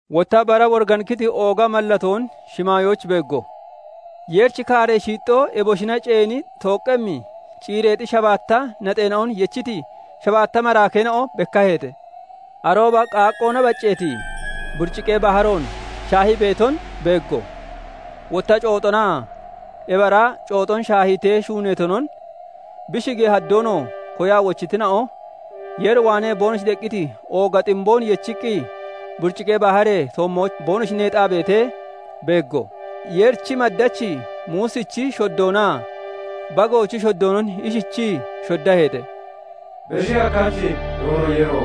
Wotta bara woriganikkiti ooga mallatoon shimaayooch beeggo; Yeerichi kaaree shiixxoo eboshina ceeni tooqqemmi ciireexi shabaatta naxeena'on yechiti shabaatta maraakeena'o bekkaheete. Arooba qaaqqoona bacceeti buriciqee baharoon shaahii beeton beeggo; wotta cooxonaa ebi ara cooxon shaahiitee shuuneetonon, bi shigee haddoonoo koyaa wochitina'o Yeer waanee boonoshi deqqiti ooga ximboon yechiqqi buriciqee baharee toommooch boonoshi neexaa beetee beeggo. Yeerichi maddachi Muusichi shoddoonaa Bagoochi shoddoonon ishichii shoddaheete:- "Beshi Hakkachi Doono Yeero!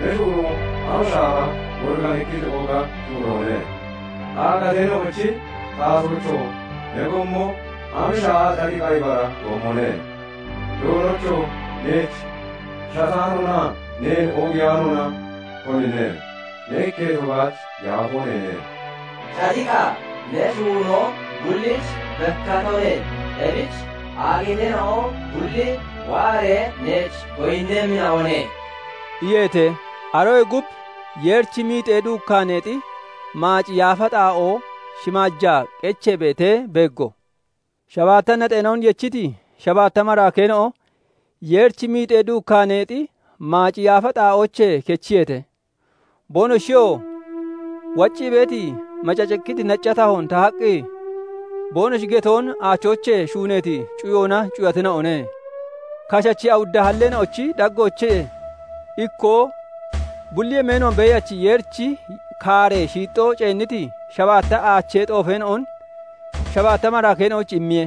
Ne shuunoo am shaaha woriganikkiti ooga shuunoone! Aagateena'ochi Taatoocho! Ne gommo am shaaha cadiqa ibara gommone! Doonocho! Neech shataanoonaa neen oogiyaanoona, konine? Ne ikketo baach yaafoo neene; cadiqa ne shuunoo bullich bekkatone; ebich aagateena'o bulli waaree neech goyinnemmina'one" iyeete. Aroyee gub Yeerichi miixee duukkaneexi maaci yaafa xaa'oo shimaajaa qechee beetee beeggo; shabaatta naxeena'on yechiti shabaatta maraakeena'o Yeerichi miixee duukkaaneexi maaci yaafa xaa'oochee kechiyeete; boonoshiyoo waccii beeti, macacikkiti nacca tahoon tahaqqi, boonoshi getoon aachoochee shuuneeti cuyoona cuyatina'one. Kashachi awudda halleena'ochi daggoochee ikkoo bulli yemeenoon Beeyachi Yeerichi kaaree shiixxoo ceenniti shabaatta aachee xoofeena'on shabaatta maraakeena'oyich immiye.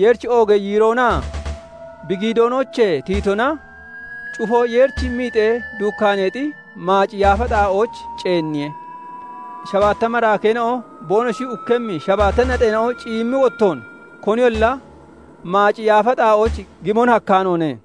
Yeerichi oogee yiiroonaa bi giidoonoochee tiyitona cufoo Yeerichi miixee duukkaaneexi maaci yaafa xaa'ooch ceenniye; shabaatta maraakeena'o boonoshi ukkemmi shabaatta naxeena'o ciyimmi wottoon koniyolla maaci yaafa xaa'ooch gimon hakkaanoone.